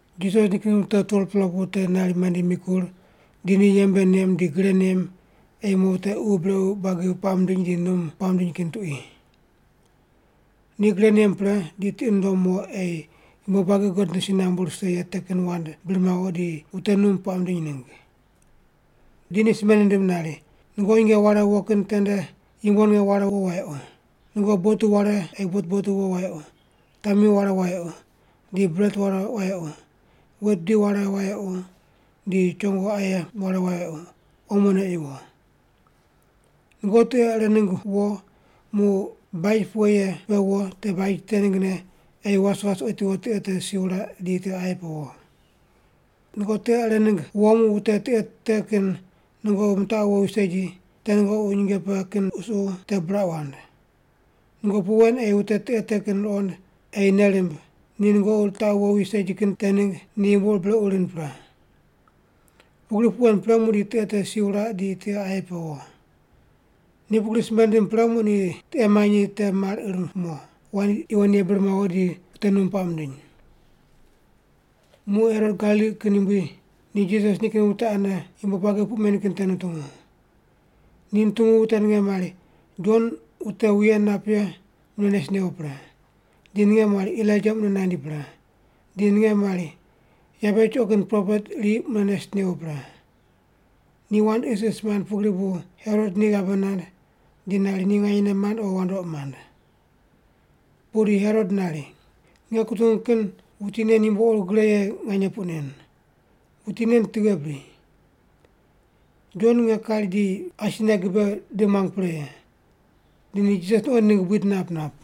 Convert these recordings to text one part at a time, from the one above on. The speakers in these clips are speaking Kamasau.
Jisas nikin wute 12-pela pu te nari mandi mikur, di ni yembe nem di gre nem ei mo wute ququ brequ buagi puaq mindiny di num puaq mindiny kin tuqui. Ni gre nem pre di tiqi nundom mo ei yumbo buagi God nde si nambu rise ye te kin wand bir mawo di wute num puaq mindiny ningg. Di ni simbe nindim nari, “Nungoqi nyinge ware wo kin tende yumbo ninge ware wo wayequ. Nungoqi botu ware ei botu botu wo wayequ, tami ware wayequ, di bret ware wayequ, wet bidi ware wayequ, di chongo aye ware wayequ, omone ei wo. Nungoqi tiqe ire ningg wo muq baj pughe ye pe wo te baj te ninggne ei was was otiwo tiqe te si wuraq di tiqe aye pe wo. Nungoqi tiqe ire ningg wo muq wute tiqe te kin nungoqi mitaqu wowi segi, te nungoqi nyinge pe kin qusuqu te buraq wand. Nungoqi puq wen ei wute tiqe te kin ruqond ei nei rimb ni nungoqi ritaqu wowi segi kin te ningg ni yumbo ur brequ rind pre. Pugri puq wen pre muqdi tiqe te si wuraq di tiqe aye pe wo.” Ni pugri simbe nindim pre muq ni tiqe manyi te mar ir mo, wand yuwon ye bir mawo di wute num puaq mindiny. Muq Herot Galili kin yumbui ni Jisas nikin wute ane yumbo buagi puq men kin te nutungu. Ni nutungu wute ninge mari Jon wute wuye nap ye mune nes newo pre. Di ninge mari Elaija mune nandi pre, di ninge mari yabe chuqo kin propet iri muq mune nes newo pre. Ni wand isis mand pugri bu Herot ni ghabe nand di nari ni nganyene mand o wandoqi mand. Pudi Herot nari, “Nge kutungu kin wuti nen yumbo ur gre ye nganye puq nen. Wuti nen tughe bri? Jon nge kari di asine gibe di muang pre ye.” Di ni Jisas nuqoind ningg buid nap nap.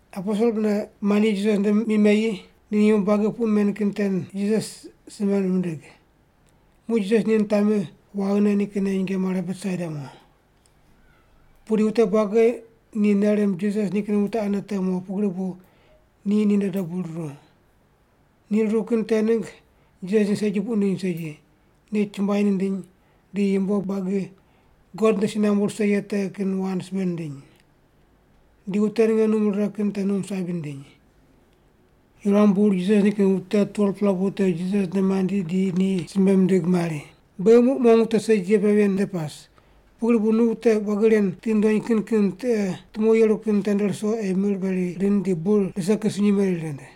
Aposel mune mandi Jisas nde mi meyi di ni yumbo buagi puq men kin te Jisas simbe mindig. Muq Jisas ni nitami waghine ni kinne nyinge mare Betsaida mo. Pudi wute buagi ni nei rimb Jisas nikin wute ane te mo pugri bu ni ninde dobu ruru. Ni ruru kin te ningg Jisas ni segi puq nindiny segi, ni chumbuai nindiny di yumbo buagi God nde si nambu rise ye te kin wand simbe nindiny. Di wute ninge num rire kin te num sabi nindiny. Yuram bur Jisas nikin wute 12-pela pu te Jisas nde mandi di ni simbe mindig mari, “Beghi muq mong wute segi ye pe ven nde pas, pugri bu nu wute buagi ren tiqi ndony kin kin tiqe tumo yeru kin tende ruso ei mir meri rind di bur rise kin sunyi meri rind.”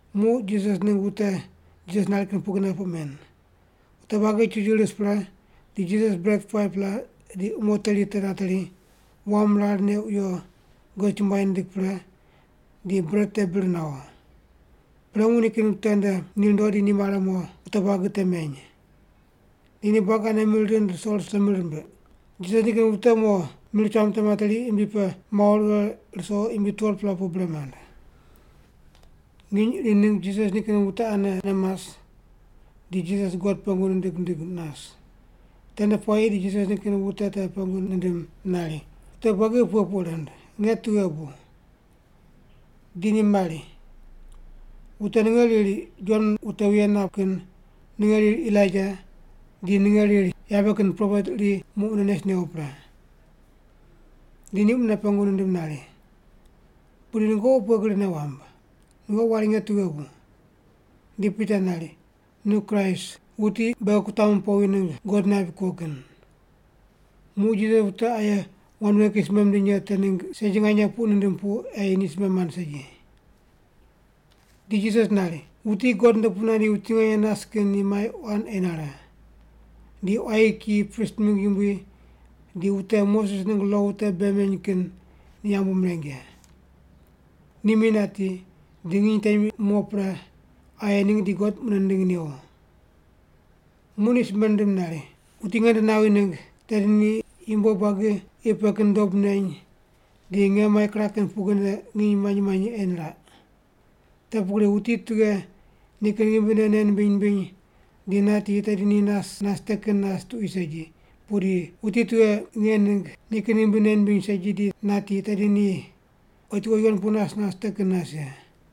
Muq Jisas ningg wute Jisas nari kin pugrine puq men. Wute buagi chuchu ris pre, di Jisas bret 5-pela di umo teri te nateri, wam rar neq wiyo God chumbuai nindig pre di bret te bir nawo. Pre muq nikin wute nde ni rundo di ni mare mo wute buagi te meny. Di ni buagi ane mir rind ruso ruso mir rimbiq. Jisas nikin wute mo mir cham te materi imbi pe mawo righe ruso imbi 12-pela pu bre mand. Nginy iri ningg Jisas nikin wute anene mas, di Jisas God pengu nindig nindig nas. Tende puayi di Jisas nikin wute te pengu nindim nari, “Wute buagi pughe puq rind, nge tughe bu?” Di ni mari, “Wute ninge riri Jon wute wuye nap kin, ninge riri Elaija, di ninge riri yabe kin propet iri muq mune nes newo pre.” Di ni mune pengu nindim nari, “Pudi nungoqi pughe gri nei wamb? Nungoqi wari nge tughe bu?” Di Pita nari, “Nu Kraist, wuti beghi kutamu powi ningg God naip kuo kin.” Muq Jisas ni wute aye wand ven kin simbe mindiny ye te ningg segi nganye puq nindim pu ei ni simbe mand segi. Di Jisas nari, “Wuti God nde pu nandi wuti nganye nas kin ni mai quan ei nare. Di quayi kiyi, prist mingg yumbui di wute Moses ningg lo wute bei meny kin ni yambu mireng ye. Ni mi nati, di nginy temi mo pre aye ningg di God mune nindingi newo.” Muq ni simbe nindim nari, “Wuti nge nde nawi ningg, tedi ni yumbo buagi qi pe kin te dob neny di nge mai kiraq kin pugrine nginy manyi manyi ei niraq. Te pugri wuti tughe nikin ghimbine nei nimbiny nimbiny di nati tedi ni nas nas te kin nas tuqui segi, pudi wuti tughe nge ningg nikin ghimbi nei nimbiny segi di nati tedi ni otiwo yuwon pu nas nas te kin nas ye.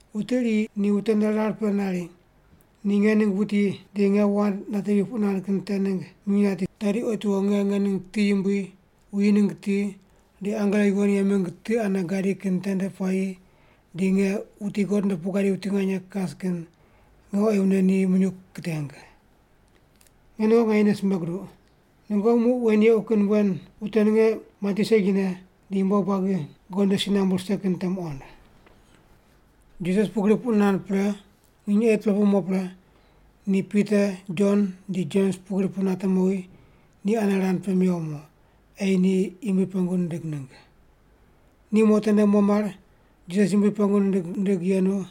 Wuti iri ni wute nde rar pe nari ni nge ningg wuti di nge wand natevi puq nand kin te ningg minyuw nati, tedi otiwo nge ngening ti yumbui, wuyi ningg ti, di angelo yuwon ye mingg ti ane gadi kin tende puayi di nge, wuti God nde pu gadi wuti nganye kas kin, nge oyi mune ni minyuw kiteng. Nge nungoqi nganyene simbe guduq, nungoqi muq wen yequ kin wen wute ninge mati segine di yumbo buagi God nde si nambu rise kin te muqond.” Jisas pugri puq nand pre, nginy 8-pela pu mo pre, ni Pita Jon di Jems pugri pu nate mowi, ni ane rand pe mewo mo, ei ni Yumbui pengu nindig ningg. Ni mo tende mo mar, Jisas Yumbui pengu nindig nindig yenu,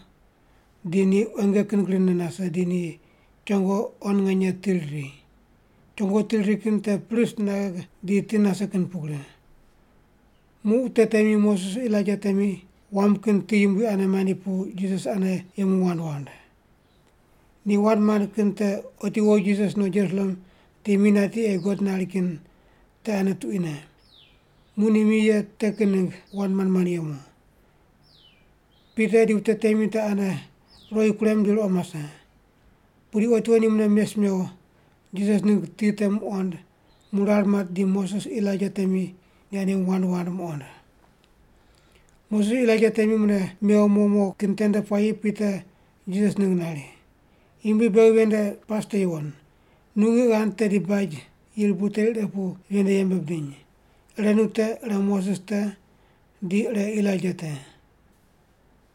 di ni quenge kin grine nase di ni chongo quan nganye ti riri. Chongo ti riri kin te pris naghe di ti nase kin pugri. Muq wute temi, Moses Elaija temi wam kin ti yumbui ane mandi pu Jisas ane yemu wand wand. Ni wand mand kin te otiwo Jisas no Jerusalem di mi nati ei God nari kin te ane tuquine. Muq ni mi ye te kin ningg wand mand mand yemu. Pita di wute temi te ane ruqoi kurem di ruqo mase. Pudi otiwo ni mune mes mewo, Jisas ningg ti te muqond muq rar mat di Moses Elaija temi ni ane yemu wand wand muqond. Moses Elaija temi mune mewo mo mo kin tende puayi Pita Jisas ningg nari, “Yumbui, beghi ven nde pas te yuwon. Nu ngiq ghand tedi beghi baj yirbu teri ire pu ven nde yembe bidiny. Ire nu te, ire Moses te, di ire Elaija te.”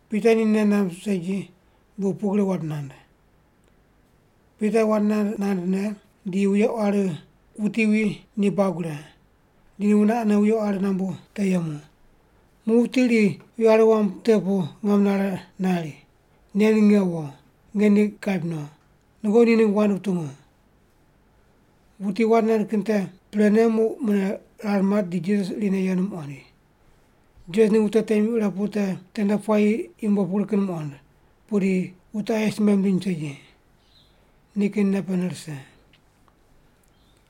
Pita ni nei namb segi, bu pugri wand nand. Pita wand nand nandne di wuye quari wuti wi ni buag wure. Di ni wune ane wuye quari nambu te yemu. Muq wuti iri wuye quari wam te pu ngam nare nari, “Nen nge wo, nge ni kaip no. Nungoqi ni ningg wand wutungu.” Wuti wand nand kin te prene muq mune rar mat di Jisas irine yenu muqoind. Jisas ningg wute temi ire pu te tende puayi yumbo pugri kin muqond, pudi wute aye simbe mindiny segi. Nikin nei pene rise.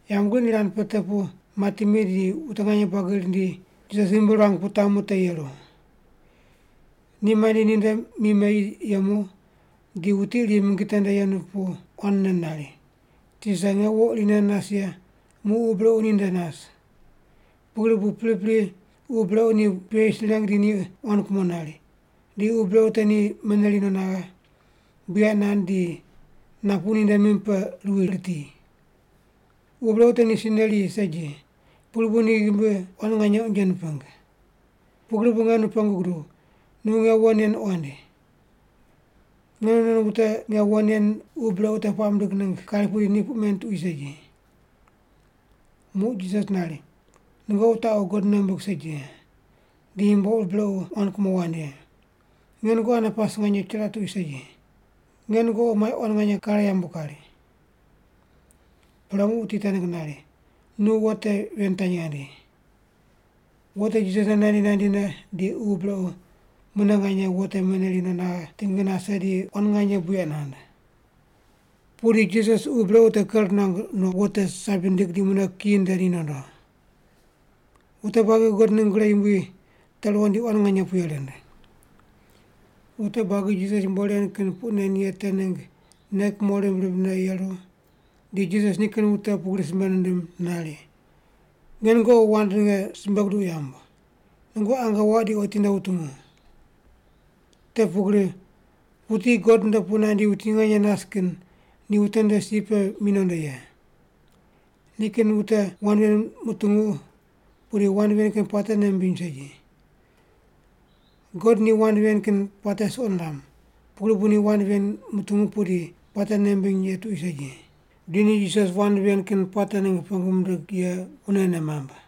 Yambgriq ni rand pe te pu mati mi di wute nganye buagi rindi, Jisas ghimbi ruang pu tamu te yeru. Ni mandi ninde mi meyi yemu, di wuti iri mingi tende yenu pu quanne nari, “Tisa, nge wo irine nas ye muq ququ brequ ni nde nas. Pugri bu pripri ququ brequ ni puye yis nireng di ni quan kumo nari, di ququ brequ te ni meneri no naghe, buyaq nand di napu ninde mim pe ruwi riti. Ququ brequ te ni si neri segi, pugri bu ni ghimbi quan nganye unje niping. Pugri bu nge nu pengu guduw, nu nge wo nen qoind. Nge nu non wute nge wo nen ququ brequ te puaq mindig ningg kari pudi ni puq men tuqui segi.” Muq Jisas nari, “Nungoqi wutaqu God nei wumbig segi ye, di yumbo ur brequ quan kumo wand ye. Nge nungoqi ane pas nganye chiraq tuqui segi. Nge nungoqi mai quan nganye kare yambu kari.” Pre muq wuti te ningg nari, “Nu wo te ven tanyi ghandi.” Wo te Jisas nde nandi nandine di ququ brequ mune nganye wo te meneri no naghe tingi nase di quan nganye buyaq nand. Pudi Jisas ququ brequ te ker nuang no, wo te sabi nindig di mune kiyi nde ni nondo. Wute buagi God ningg gre yumbui te ruqond di quan nganye puye rind. Wute buagi Jisas yumbo ren kin puq nen ye te ningg nei kumo rimb rimbne yeru, di Jisas nikin wute pugri simbe nindim nari, “Nge nungoqi wand ninge simbe guduq yamb. Nungoqi ange waq di otinde wutungu. Te pugri wuti God nde pu nandi wuti nganye nas kin ni wute nde si pe mi nondo ye.” Nikin wute wand ven mutungu pudi wand ven kin puate nei mimbiny segi. God ni wand ven kin puate suqo niram, pugri bu ni wand ven mutungu pudi puate nei mimbiny ye tuqui segi. Di ni Jisas wand ven kin puate ningg pengu mindig ye wunene mamb.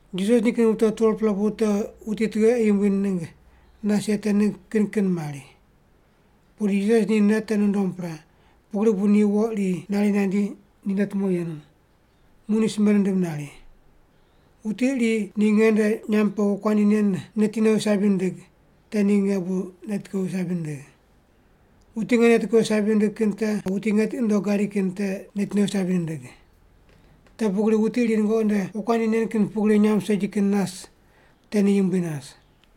Jisas ningg wute 12-pela pu te wuti tughe ei yumbui ningg nas ye te ningg kin kin mari. Pudi Jisas ni nei te nundom pre, pugri bu ni wo iri nari nandi ni nde tumo yenu, muq ni simbe nindim nari, “Wuti iri ni nge nde nyamb pe wokuandi nen neti nowi sabi nindig, te ni nge bu neti kowi sabi nindigh. Wuti nge neti kowi sabi nindigh kin te wuti nge tiqi nundogh gadi kin te neti nowi sabi nindig. Te pugri wuti iri nungoqi nde wokuandi nen kin pugri nyamb segi kin nas te ni yumbui nas.”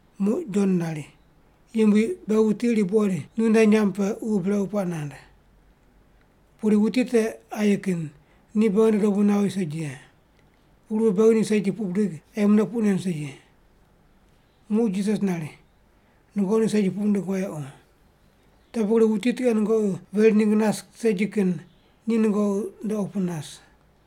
Muq Jon nari, “Yumbui, beghi wuti iri buqoid nu nde nyamb pe ququ brequ puaq nand. Pudi wuti te aye kin, ni beghi nde dobu nawi segi ye. Pugri bu beghi ni segi puq bidig ei mune puq nen segi.” Muq Jisas nari, “Nungoqi ni segi puq wundig wayequ. Te pugri wuti tughe nungoqi veri ningg nas segi kin ni nungoqi nde opu nas.”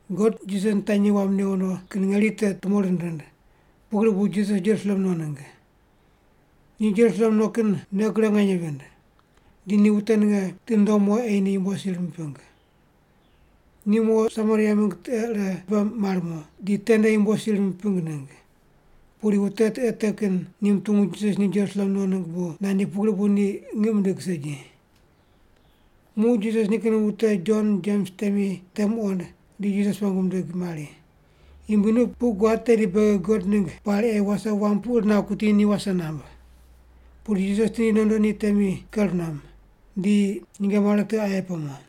God Jisas nitanyi wam newo no kin ngeri te tumo rind rind, pugri bu Jisas Jerusalem no ningg. Ni Jerusalem no kin nei gre nganye vind, di ni wute ninge tiqi nundom mo ei ni yumbo sir miping. Ni mo Samaria mingg tiqe ire pe mar mo, di tende yumbo sir miping ningg. Pudi wute tiqe te kin ni mutungu Jisas ni Jerusalem no ningg bu nandi pugri bu ni ngiq mindig segi. Muq Jisas nikin wute Jon Jems temi te muqond, di Jisas pengu mindig mari, “Yumbui, nu puq guad tedi beghi God ningg pari ei wase wam pu ir nawo kuti ni wase namb.” Pudi Jisas tindi nondo ni temi ker nuam. Di ni nyinge mare tiqe aye pe mo.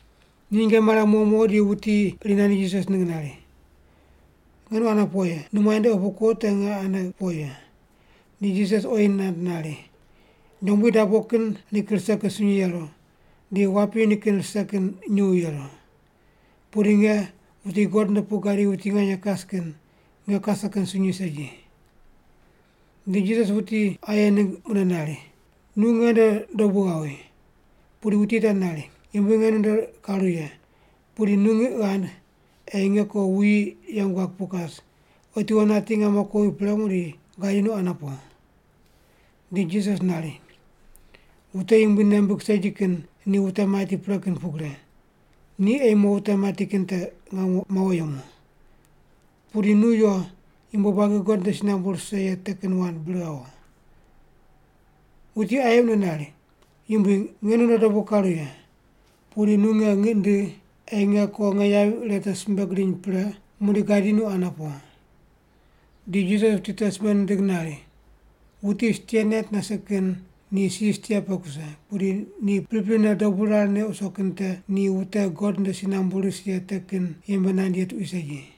Ni nyinge mare mo mo di wuti iri nandi Jisas ningg nari, “Nge nu ane po ye. Nu muainde opu kuo te nge ane po ye.” Di Jisas oyi nand nari, “Nyombui dabo kin nikin rise kin sunyi yeru, di wapi nikin rise kin nyuw yeru. Pudi nge, wuti God nde pu gadi wuti nganye kas kin, nge kase kin sunyi segi.” Di Jisas wuti aye ningg mune nari, “Nu nge nde dobu ghawi.” Pudi wuti te nari, “Yumbui, nge nu nde karu ye. Pudi nu ngiq ghand ei nge ko wuyi yeng guag pu kas, otiwo nati ngamo kowi pre muqdi gadi nu ane po.” Di Jisas nari, “Wute Yumbui nei mimbig segi kin ni wute mati pre kin pugri. Ni ei mo wute mati kin te mawo yemu. Pudi nu yo, yumbo buagi God nde si nambu rise ye te kin wand bir ghawo.” Wuti aye mune nari, “Yumbui, nge nu nde dobu karu ye. Pudi nu nge ngiq ndigh ei nge ko nge yavi ire te simbe gidiny pre muqdi gadi nu ane po.” Di Jisas wuti te simbe nindig nari, “Wuti stia nait nase kin ni si stia pe kuse, pudi ni priprine dobu rar neq wuso kin te ni wute God nde si nambu ris ye te kin yembe nand ye tuqui segi.”